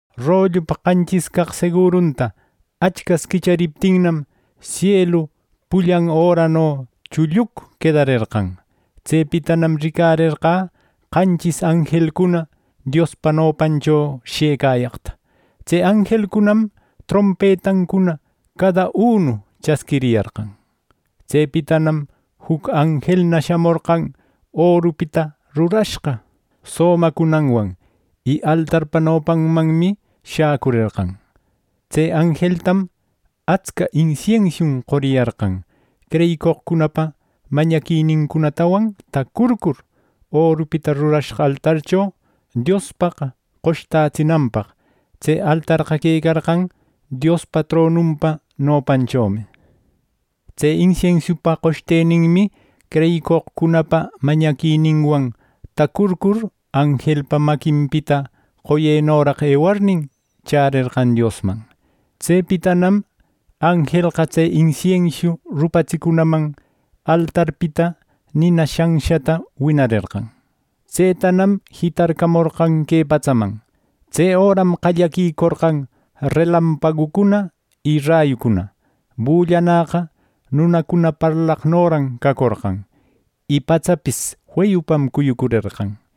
Rollupa qanchis caq segurunta Achcas quichariptinnam; sielu pullan örano chulluc quedarerqan. Tsepitanam ricarerqä qanchis anjelcuna Diospa nopancho shëcayaqta. Tse anjelcunam trompetancuna cada unu chasquiriyarqan. Tsepitanam juc anjelna shamorqan orupita rurashqa somacunanwan, y altarpa nopanmanmi shäcurerqan. Tse anjeltam atsca insiensiun qoriyarqan, creyicoqcunapa mañaquinincunatawan tacurcur, orupita rurashqa altarcho Diospaq qoshtätsinanpaq. Tse altarqa quecarqan Diospa tronunpa nopanchomi. Tse insiensiupa qoshteninmi creyicoqcunapa mañaquininwan tacurcur anjelpa maquinpita qoyenoraq ewarnin, chärerqan Diosman. Tsepitanam anjelqa tse insiensiu rupatsicunanman altarpita nina shanshata winarerqan. Tsetanam jitarcamorqan que patsaman. Tse öram qallaquicorqan relampagucuna y rayucuna. Bullanäqa nunacuna parlaqnoran cacorqan, y patsapis feyupam cuyucurerqan.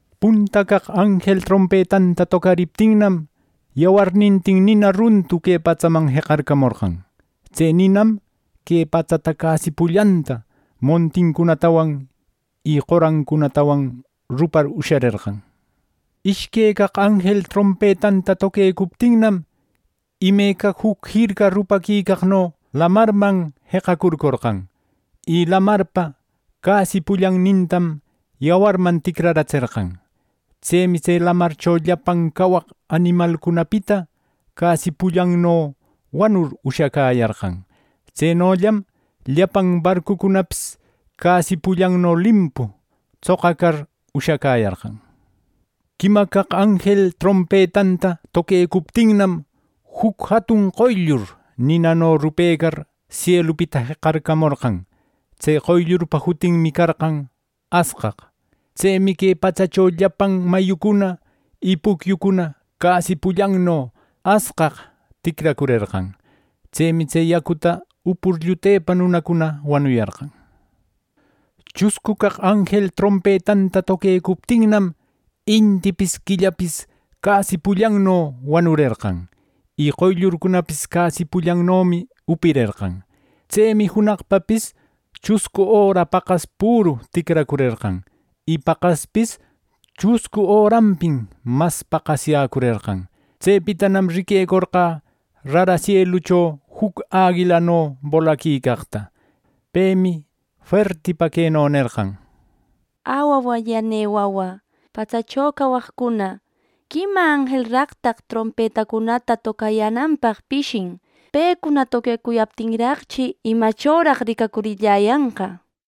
Punta caq anjel trompetanta tocariptinmi, yawarnintin nina runtu que patsaman jeqacarcamorqan. Tse ninam que patsata casi pullanta montincunatawan y qorancunatawan rupar usharerqan. Ishque caq anjel trompetanta toquecuptinnam, imeca juc jirca rupaquicaqno lamarman jeqacurcorqan. Y lamarpa casi pullannintam yawarman ticraratserqan Tsemi tse lamarcho llapan cawaq animalcunapita casi pullanno wanur ushacäyarqan. Tsenollam llapan barcucunapis casi pullanno limpu tsoqacar ushacäyarqan. Quima caq anjel trompetanta toquecuptinnam, juc jatun qoyllur ninano rupecar sielupita jeqacarcamorqan. Tse qoyllurpa jutinmi carqan “Asqaq”. Tsemi que patsacho llapan mayucuna y pucyucuna casi pullanno asqaq ticracurerqan. Tsemi tse yacuta upur llutepa nunacuna wanuyarqan. Chuscu caq anjel trompetanta toquecuptinnam, intipis quillapis casi pullanno wanurerqan, y qoyllurcunapis casi pullannomi upirerqan. Tsemi junaqpapis chuscu öra paqas püru ticracurerqan, y paqaspis chuscu öranpim mas paqasyäcurerqan. Tsepitanam riquecorqä rara sielucho juc aguilano bolaquicaqta. Pemi fuertipa queno nerqan: “¡Ä, wawallanï wawä, patsacho cawaqcuna! ¡Quima anjelraqtaq trompetancunata tocayänanpaq pishin! Pecuna toquecuyaptinraqchi, ¿Imachoraq ricacurilläyanqa!” nir.